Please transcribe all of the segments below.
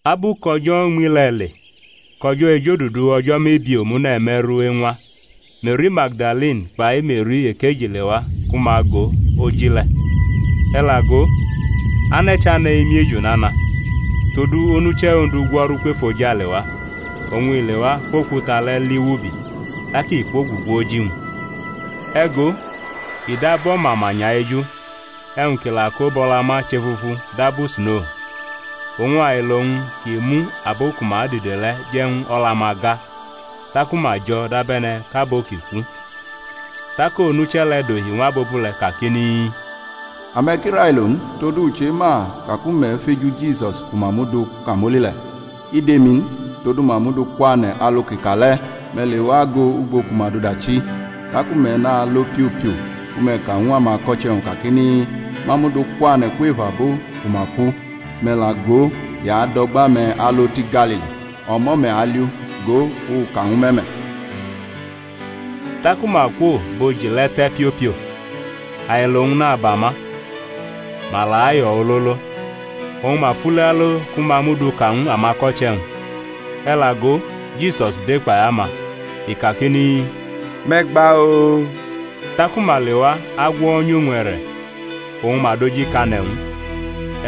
Abu kʼo̩jo̩ uñmi le̩ le, kʼo̩jo̩ ejodudu o̩jo̩ mebie omune̩ me̩ru eñwa, Me̩ri Magdalini kpai Me̩ri ekeji lewa ku ma go oji le̩. E̩ la go, ane̩ chane̩ emiejo nana; todu onuche̩ Ondu gwo̩ru kwʼefojale wa, oñ i lewa fʼokuta le̩ li wʼubi, tak i kwogugu oji-wñ. E̩ go i dab o̩mamanya eju, e̩wñ kʼi la ko bʼo̩la ma chʼefufu dabu sno. Oñ ailo-wñ ki mu abo ku ma dide le̩ je̩ ñw o̩la-ma ga, taku ma jo̩ dabe̩ne̩ kʼabo ki ku. Tak onuche̩ le̩ dohi ñw abobule̩ kakini, Ame̩ ki railo n; todu u chema ka ku me̩ feju Jisus ku ma mʼu du kamoli le̩. I dʼemi n; todu ma mʼu du kwane̩ alu kʼi ka le̩; me̩ lewa go ugbo ku ma dʼu dachi. Taku me̩ nalo piopio ku me̩ ka ñw amako̩che̩-wñ, kakini, Ma mʼu du kwane̩ kwef abo ku ma ku; me̩ la go, i adʼo̩gba-me̩ alo ti Galili, o̩mo̩ me̩ aliʼu. Go, u ka ñwu me̩ me̩. Taku ma kwo bʼoji le̩ te̩ piopio, ailo-wñ naba ma, ma la ayo̩ ololo. Oñ ma fule alo ku ma mʼu du ka ñw amako̩che̩-wñ. E̩ la go, Jisus de kpai ama, i kakini, Me̩ gba-oo! Taku ma lewa gwo̩nyʼowñ e̩re̩, oñ ma dojikane̩ ñw u.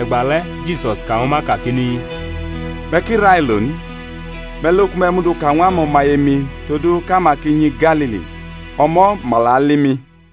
E̩gbale̩ Jisus ka ñwu ma kakini, Me̩ ki railo n. Me̩ lo ku me̩ mudu ka ñw amo̩maye-mi todu kʼama ki nyi Galili; o̩mo̩ ma la ali mi.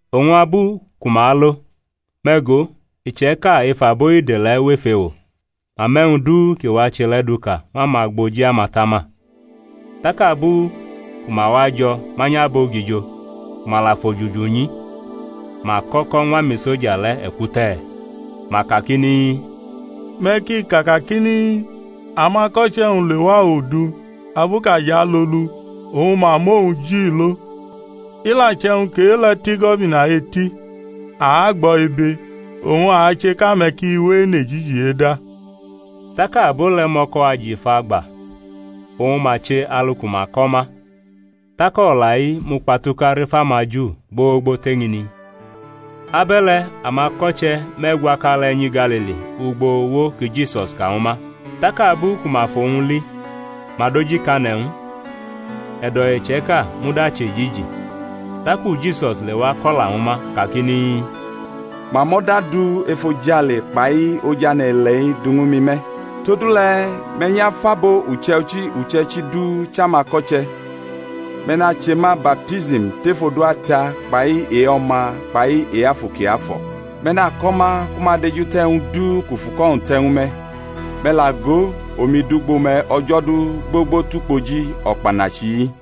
Oñ abu ku ma alo, me̩ go, iche̩ka ef abo ide le̩ wʼef ewo, ma mʼe̩wñ du ki wache le̩ duka ñw amagboji amatama. Tak abu ku ma wajo̩ manyʼabogijo, ku ma la fʼojuju nyi, ma kʼo̩ko̩ ñw amisoja le̩ e̩kute̩; ma kakini, Me̩ ki ka kakini, Amako̩che̩-wñ lewa odu abu kʼa jʼalolu oñ ma mʼowñ ji lo. I la che̩wñ kʼe-le̩ tʼigo̩bina eti, a agbʼo̩ ibe, oñ ache kʼame̩ ki we enʼejiji eda. Tak abo le̩ mʼo̩ko̩ ajifa gba oñ ma che alu ku ma ko̩ ma. Tak o̩la-i mukpatuka rʼef amaJu gbogbo tʼeñini. Abe̩le̩ amako̩che̩ me̩gwaka le̩ nyi Galili ugbo uwo ki Jisus ka ñwu ma. Tak abu ku ma fʼowñ li ma dojikane̩ ñw u; e̩do̩ iche̩ka muda chʼe̩jiji. Taku Jisus lewa ko̩la ñwu ma kakini, Ma mʼo̩da du efojale kpai oj ane̩-ile̩-i du ñwu mi me̩. Todule̩ me̩ nyʼafʼabo uche̩ichi uche̩ichi du chʼamako̩che̩; me̩ nache ma baptism tef odu Ata kpai e-O̩ma kpai e-Afu Kiafo̩; me̩ nako̩ ma ku ma dejute̩ e̩wñ du kʼu fʼuko̩-wñ te̩ ñwu me̩. Me̩ la go, omi dʼugbo me̩ o̩jo̩ du gbogbo tʼukpoji o̩kpanachi-i.